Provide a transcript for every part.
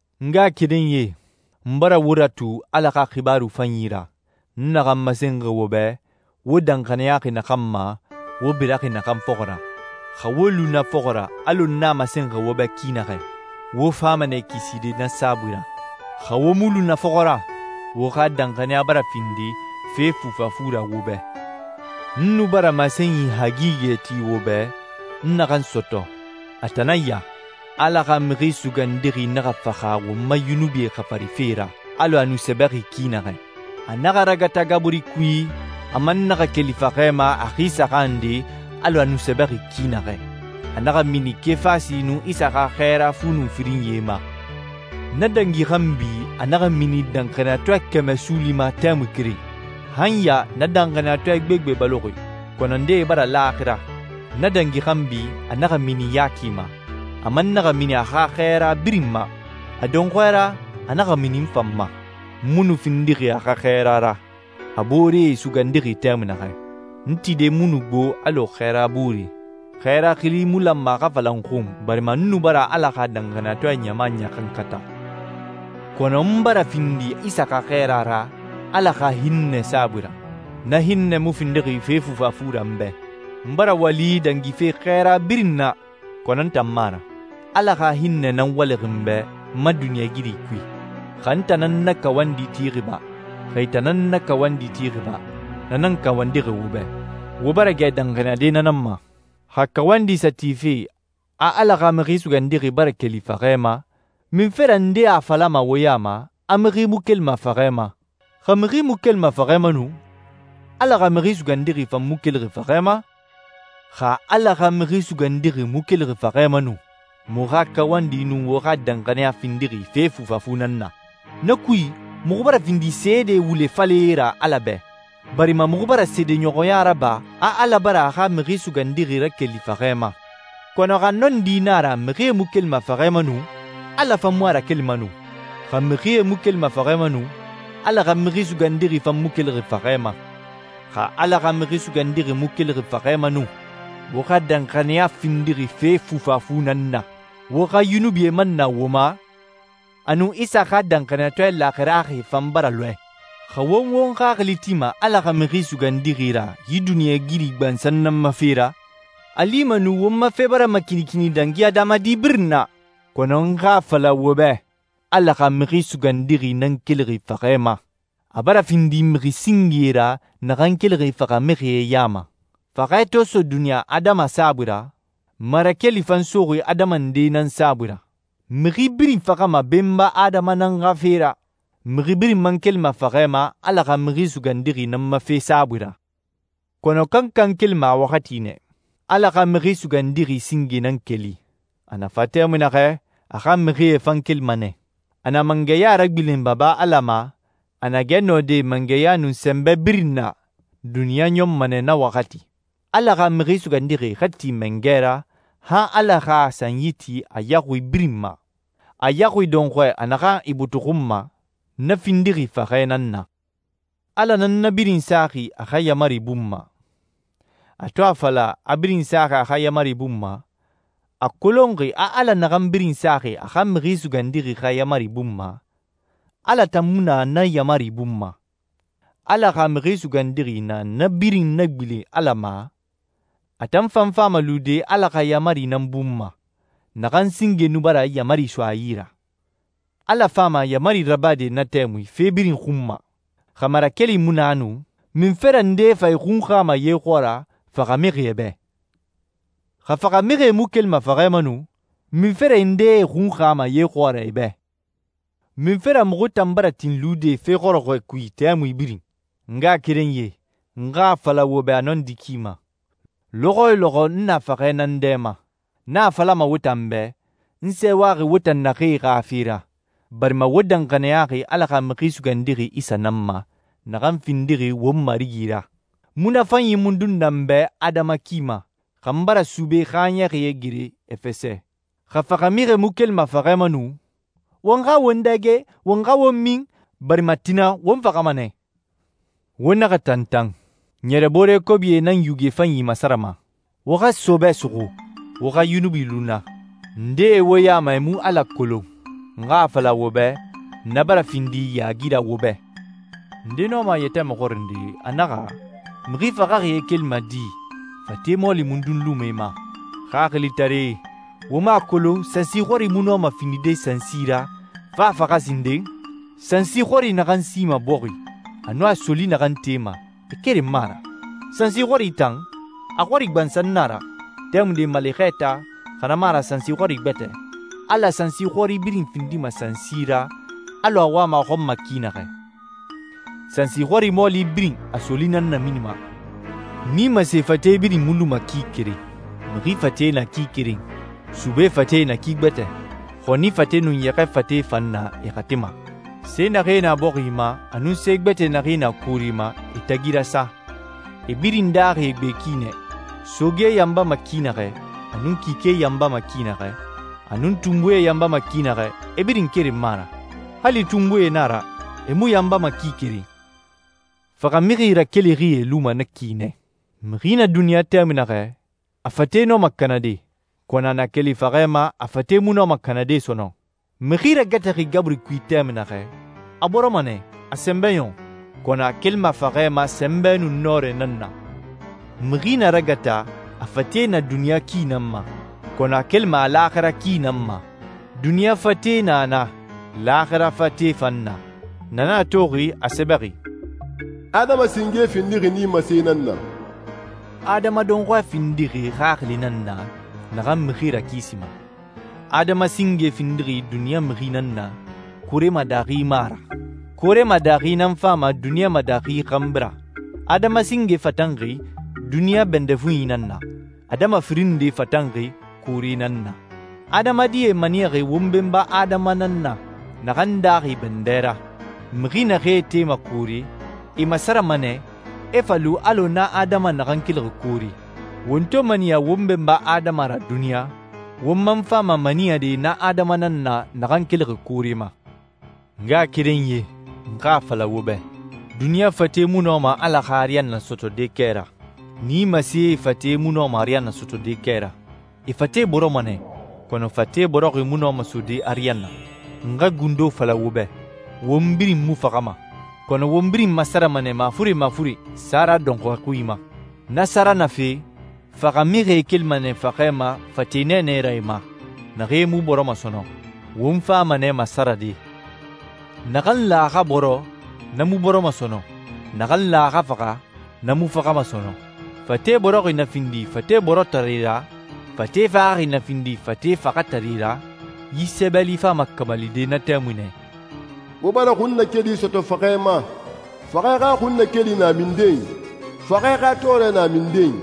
N ngaxakerenyie, n bara wo ratu Ala xa xibaaru fanyi ra, n naxan masenxi wo bɛ, wo danxaniyaxi naxan ma, wo biraxi naxan fɔxɔ ra. Xa wo lu na fɔxɔ ra alɔ n a masenxi wo bɛ ki naxɛ, wo fama nɛ kiside na saabui ra. Xa wo mu lu na fɔxɔ ra, wo xa danxaniya bara findi fe fufafu ra wo bɛ. N nu bara masenyi hagigɛ ti wo bɛ, n naxan sɔtɔ. A tan nan ya. Ala xa Mixi Sugandixi naxa faxa won ma yunubie xafari fe ra, alɔ a nu sɛbɛxi ki naxɛ. A naxa ragata gaburi kui, a man naxa keli faxɛ ma a xi saxan nde, alɔ a nu sɛbɛxi ki naxɛ. A naxa mini Kefasi nun Isa xa xɛɛra fu nun firinyie ma. Na dangi xanbi, a naxa mini danxaniyatɔɛ kɛmɛ suuli ma tɛmui keren. Han ya na danxaniyatɔɛ gbegbe baloxi, kɔnɔ ndee bara laaxira. Na dangi xanbi, a naxa mini Yaki ma, a man naxa mini a xa xɛɛra birin ma. A dɔnxɔɛ ra, a naxa mini n fan ma. N mu nu findixi a xa xɛɛra ra, a booree sugandixi tɛmui naxɛ. N tide mu nu gbo alɔ xɛɛra booree. Xɛɛra xili mu lanma a xa fala n xun, barima n nu bara Ala xa danxaniyatɔɛ ɲama ɲaxankata. Kɔnɔ n bara findi Isa xa xɛɛra ra Ala xa hinnɛ saabui ra. Na hinnɛ mu findixi fe fufafu ra n bɛ. N bara wali dangife xɛɛra birin na, kɔnɔ n tan mu a ra. Ala xa hinnɛ nan walixi n bɛ n ma duniɲɛigiri kui. Xa n tan nan na kawandi tixi ba, xa e tan nan na kawandi tixi ba, na nan kawandixi wo bɛ. Wo bara gɛ danxaniyade na nan ma. Xa kawandi sa tife a Ala xa Mixi Sugandixi bara keli faxɛ ma, munfe ra ndee a falama wo ya ma a mixi mu kelima faxɛ ma? Xa mixi mu kelima faxɛ ma nu, Ala xa Mixi Sugandixi fan mu kelixi faxɛ ma. Xa Ala xa Mixi Sugandixi mu kelixi faxɛ ma nu, muxu xa kawandi nun wo xa danxaniya findixi fe fufafu nan na. Na kui, muxu bara findi seede wule falɛe ra Ala bɛ, barima muxu bara seedeɲɔxɔya raba a Ala bara a xa Mixi Sugandixi rakeli faxɛ ma. Kɔnɔ xa nɔndi na a ra mixie mu kelima faxɛ ma nu, Ala fan mu a rakelima nu. Xa mixie mu kelima faxɛ ma nu, Ala xa Mixi Sugandixi fan mu kelixi faxɛ ma. Xa Ala xa Mixi Sugandixi mu kelixi faxɛ ma nu, wo xa danxaniya findixi fe fufafu nan na, wo xa yunubie man na wo ma, a nun Isa xa danxaniyatɔɛ laaxiraxie fan bara lɔɛ. Xa won won xaxili tima Ala xa Mixi Sugandixi ra yi duniɲɛigiri gbansan nan ma fe ra, a lima nu won ma fe bara makinikini dangi adamadi birin na. Kɔnɔ n xa a fala wo bɛ, Ala xa Mixi Sugandixi nan kelixi faxɛ ma. A bara findi mixi singe ra naxan kelixi faxamixie ya ma. Faxɛ to so duniɲa adama saabui ra, marakeli fan soxi adama nde nan saabui ra. Mixi birin faxama Benba Adama nan xa fe ra. Mixi birin man kelima faxɛ ma Ala xa Mixi Sugandixi nan ma fe saabui ra. Kɔnɔ kankan kelima a waxati nɛ. Ala xa Mixi Sugandixi singe nan keli. A na fa tɛmui naxɛ, a xa mixie fan kelima nɛ. A na mangɛya ragbilen Baba Ala ma, a na gɛ nɔde mangɛya nun sɛnbɛ birin na, duniɲa ɲɔnma nɛ na waxati. Ala xa Mixi Sugandixi xa ti mangɛ ra, han Ala xa a sanyi ti a yaxui birin ma. A yaxui dɔnxɔɛ a naxan ibutuxunma, na findixi faxɛ nan na. Ala nan na birin saxi a xa yaamari bun ma. A to a fala a birin saxi a xa yaamari bun ma, a kolonxi a Ala naxan birin saxi a xa Mixi Sugandixi xa yaamari bun ma, Ala tan mu na na yaamari bun ma. Ala xa Mixi Sugandixi na na birin nagbilen Ala ma, a tan fan fama lude Ala xa yaamari nan bun ma, naxan singe nu bara yaamari so a yi ra. Ala fama yaamari rabade na tɛmui fe birin xun ma. Xa marakeli mu na nu, munfe ra ndee fa e xunxama ye xɔɔra faxamixie bɛ? Xa faxamixie mu kelima faxɛ ma nu, munfe ra ndee e xunxama ye xɔɔra e bɛ? Munfe ra muxu tan bara tin lude fe xɔrɔxɔɛ kui tɛmui birin? N ngaxakerenyie, n xa a fala wo bɛ a nɔndi ki ma, lɔxɔ yo lɔxɔ n na faxɛ nan dɛ ma. N a falama wo tan bɛ, n sɛɛwaxi wo tan naxee xa fe ra, barima wo danxaniyaxi Ala xa Mixi Sugandixi Isa nan ma, naxan findixi won Marigi ra. Munafanyi mundun na n bɛ adama ki ma, xa n bara sube xaaɲɛxie gere Efɛsɛ? Xa faxamixie mu kelima faxɛ ma nu, «won xa won dɛge, won xa won min, barima tina won faxama nɛ.» Wo naxa tantan. Ɲɛrɛboore kobie nan yuge fanyi masarama. Wo xa sɔɔbɛ suxu, wo xa yunubi lu na. Ndee wo ya ma e mu Ala kolon. N xa a fala wo bɛ, na bara findi yaagi ra wo bɛ. Nde nɔma a yɛtɛ maxɔrinde, a naxɛ, «Mixi faxaxie kelima di? Fate mɔɔli mundun luma e ma?» Xaxilitaree, wo mu a kolon sansi xɔri mu nɔma findide sansi ra, fo a faxa sinden? Sansi xɔri naxan sima bɔxi, a nun a soli naxan tema, e keren mu a ra. Sansi xɔri tan, a xɔri gbansan na a ra, tɛmunde maale xɛɛta, xa na mu a ra sansi xɔri gbɛtɛ. Ala sansi xɔri birin findima sansi ra alɔ a wama a xɔn ma ki naxɛ. Sansi xɔri mɔɔli birin a soli nan naminima. Nimase fate birin mu luma ki keren. Mixi fate na ki keren. Sube fate na ki gbɛtɛ. Xɔni fate nun yɛxɛ fate fan na e xati ma. Se naxee na bɔxi ma, a nun se gbɛtɛ naxee na koore ma, e tagi rasa. E birin daaxi e gbe ki nɛ. Soge yanbama ki naxɛ, a nun kike yanbama ki naxɛ, a nun tunbuie yanbama ki naxɛ, e birin keren mu a ra. Hali tunbuie na a ra e mu yanbama ki keren. Faxamixi rakelixie luma na ki nɛ. Mixi na duniɲa tɛmui naxɛ, a fate nɔma kanade, kɔnɔ a na keli faxɛ ma, a fate mu nɔma kanade sɔnɔn. Mixi ragataxi gaburi kui tɛmui naxɛ, a bɔrɔma nɛ, a sɛnbɛ ɲɔn, kɔnɔ a kelima faxɛ ma sɛnbɛ nun nɔrɛ nan na. Mixi na ragata a fate na duniɲa ki nan ma, kɔnɔ a kelima a laaxira ki nan ma. Duniɲa fate na na, laaxira fate fan na. Na nan a toxi a sɛbɛxi, «Adama singe findixi nimase nan na.» Adama dɔnxɔɛ findixi xaxili nan na naxan mixi rakisima. Adama singe findixi duniɲa mixi nan na, koore ma daaxi mu a ra. Koore ma daaxi nan fama duniɲa ma daaxi xanbi ra. Adama singe fatanxi duniɲa bɛndɛ fuɲi nan na. Adama firin nde fatanxi koore nan na. Adamadie maniyaxi won benba Adama nan na, naxan daaxi bɛndɛ ra. Mixi naxee tema koore, e masarama nɛ, e fa lu alɔ na Adama naxan kelixi koore. Won to maniya won benba Adama ra duniɲa, won man fama maniyade na Adama nan na naxan kelixi koore ma. N ngaxakerenyie, n xa a fala wo bɛ, duniɲa fate mu nɔma Ala xa ariyanna sɔtɔde kɛ ra. Nimasee fate mu nɔma ariyanna sɔtɔde kɛ ra. E fate bɔrɔma nɛ, kɔnɔ fate bɔrɔxi mu nɔma sode ariyanna. N xa gundo fala wo bɛ. Won birin mu faxama, kɔnɔ won birin masarama nɛ mafuren mafuren sara dɔnxɔɛ xui ma. Na sara na fe, faxamixie kelima nɛ faxɛ ma fate nɛɛnɛe ra e ma naxee mu bɔrɔma sɔnɔn. Won fama nɛ masarade. Naxan lan a xa bɔrɔ, na mu bɔrɔma sɔnɔn. Naxan lan a xa faxa, na mu faxama sɔnɔn. Fate bɔrɔxi na findi fate bɔrɔtare ra, fate faxaxi na findi fate faxatare ra, yi sɛbɛli fama kamalide na tɛmui nɛ: «Wo bara xunnakeli sɔtɔ faxɛ ma. Faxɛ xa xunnakeli na minden? Faxɛ xa tɔɔrɛ na minden?»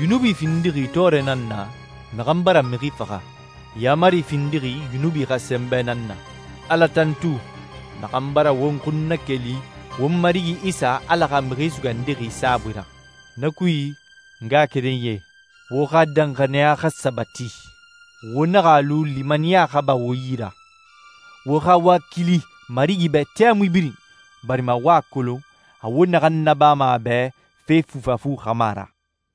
Yunubi findixi tɔɔrɛ nan na naxan bara mixi faxa. Yaamari findixi yunubi xa sɛnbɛ nan na. Ala tantu, naxan bara won xun nakeli won Marigi Isa Ala xa Mixi Sugandixi saabui ra. Na kui, n ngaxakerenyie, wo xa danxaniya xa sabati. Wo naxa a lu limaniya xa ba wo yi ra. Wo xa wakili Marigi bɛ tɛmui birin, barima wo a kolon a wo naxan nabama a bɛ fe fufafu xa mu a ra.